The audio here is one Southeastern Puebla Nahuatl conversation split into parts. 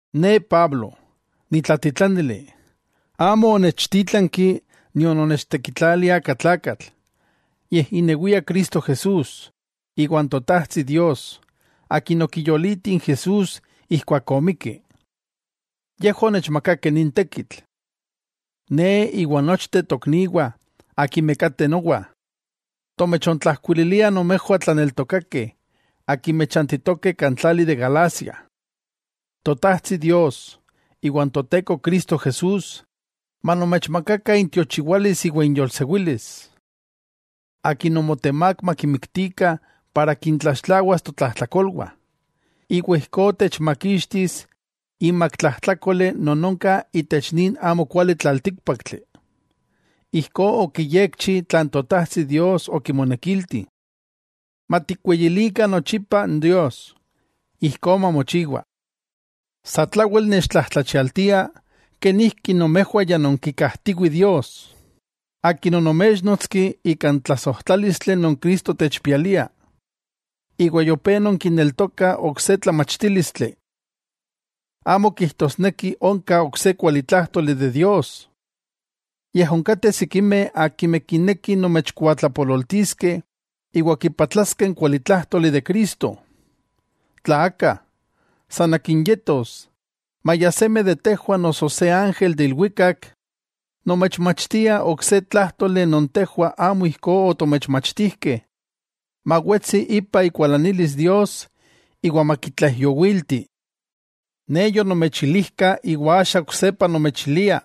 Ne, Pablo, nitlatitlanili. Amo onechtítlanki nion onechtekitlali aka tlakatl, yej inewia Cristo Jesús, iwa n Totajtsi Dios Akin okiyoliti n Jesús ijkuak omikki, yejwah onechmakakeh nin tekitl. Ne, iwa nochteh tokniwah akimeh kateh nowa, tomechontlajkuililiah nomejwah tlaneltokakeh akimeh chantitokeh kan tlali de Galacia. Totajtsi Dios iwa n Toteko Cristo Jesús manomechmakakah intiochiwalis iwa inyolsewilis. Akin omotemák makimiktikah para kintlaxtlawas totlajtlakolwah, iwa ijkó techmakixtis imak tlajtlákoli non onka itech nin amokuali tlaltíkpaktli. Ijkó okiyekchi tlan Totajtsi Dios okimonekilti. ¡Matikweyilikah nochipa n Dios! Ijkó mamochiwa. Satlawel nechtlajtlachialtia kenijki nomejwah ya nonkikajtiwih Dios, Akin onoméchnotski ika n tlasojtlálistli non Cristo techpialia, iwa yopé nonkineltokah ok se tlamachtílistli. Amo kijtosneki onka ok se kualitlájtoli de Dios. Yej onkateh sikimeh akimeh kinekih nomechkuatlapololtiskeh iwa kipatlaskeh n kualitlájtoli de Cristo. Tla aka, san akin yetos, maya seme de tejwah noso se ángel de ilwikak, nomechmachtia ok se tlájtoli non tejwah amo ijkó otomechmachtijkeh, mawetsi ipa ikualanilis Dios iwa makitlaijyowilti. Ne yonomechilijka iwa axa oksepa nomechilia: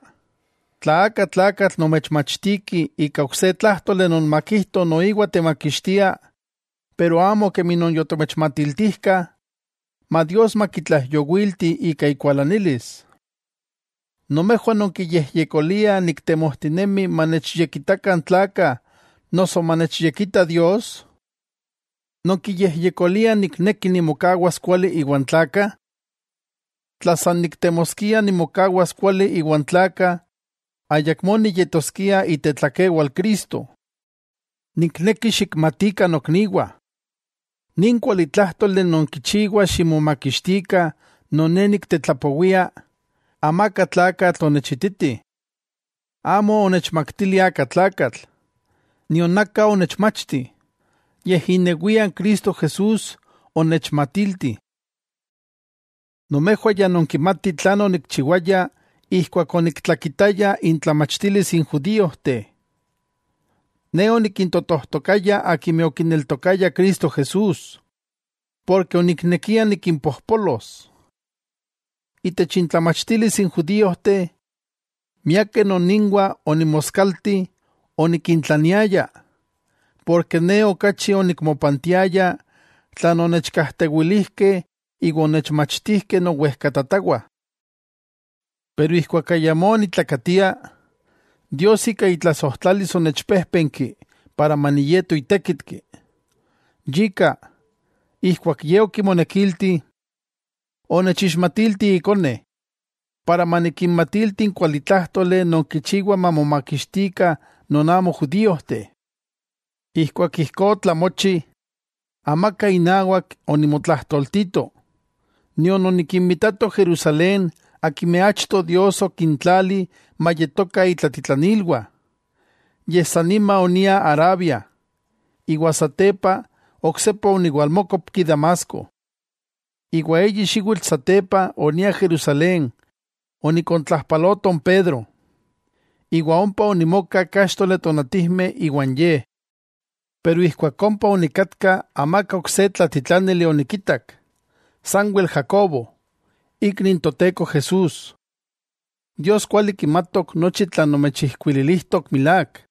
Tla aka tlakatl nomechmachtiki ika ok se tlájtoli non makijto noiwa techmakixtia, pero amo kemi non yotomechmatiltijkah, ma Dios makitlaijyowilti ika ikualanilis. ¿Nomejwah nonkiyejyekoliah niktemojtinemi manechyekitakah n tlakah noso manechyekita Dios? Nonkiyejyekoliah nikneki nimokawas kuali iwan tlakah. Tla san niktemoskia nimokawas kuali iwan tlakah, ayakmó niyetoskia itetlakewal Cristo. Nikneki xikmatikah nokniwah, nin kualitlájtoli non kichiwa ximomakixtikah non ne niktetlapowia, amaka tlakatl onechititi. Amo onechmaktili aka tlakatl, nion aka onechmachti, yej inewia n Cristo Jesús onechmatilti. Nomejwah ya nonkimatih tlan onikchiwaya ijkuak oniktlakitaya intlamachtilis n judíojteh. Ne onikintotojtokaya akimeh okineltokayah Cristo Jesús, porke oniknekia nikimpojpolos. Itech intlamachtilis n judíojteh, miakeh non inwah onimoskalti onikintlaniaya, porke ne okachi onikmopantiaya tlan onechkajtewilijkeh iwa onechmachtijkeh nowejkatatawah. Pero ijkuak ayamó onitlakatia, Dios ika itlasojtlalis onechpéjpenki para maniyeto itékitki. Yika, ijkuak Ye okimonekilti, onechixmatilti Ikone, para manikinmatilti n kualitlájtoli non kichiwa mamomakixtikah non amo judíojteh. Ijkuak ijkó otlamochi, amaka inawak onimotlajtoltito, nion onikinmitato Jerusalén akimeh achto Dios okintlali mayetokah itlatitlanilwah. Yej san nima onia Arabia, iwa satepa oksepa oniwalmókopki Damasco. Iwa eyi xiwitl satepa onia Jerusalén onikontlajpaloto n Pedro, iwa ompa onimoka káxtoli tonatijmeh iwan ye. Pero ijkuak ompa onikatka amaka ok se tlatitlanili onikitak, sanwel Jacobo, ikni n Toteko Jesús. Dios kuali kimatok nochi tlan nomechijkuililijtok milák.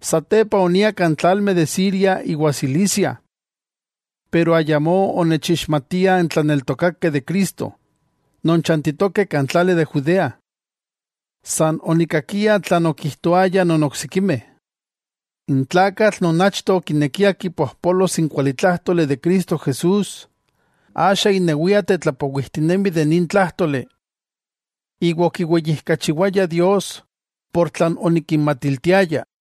Satepa, onia kan tlalmeh de Siria iwa Cilicia. Pero ayamó onechixmatiah n tlaneltokakeh de Cristo, non chantitokeh kan tlali de Judea. San okikakiah tlan okijtoayah non oksikimeh: “N tlakatl non achto okinekia kipojpolos n kualitlájtoli de Cristo Jesús, axa inewia tetlapowijtinemi de nin tlájtoli.” Iwa, okiweyijkachiwayah Dios ika tlan onikinmatiltiaya.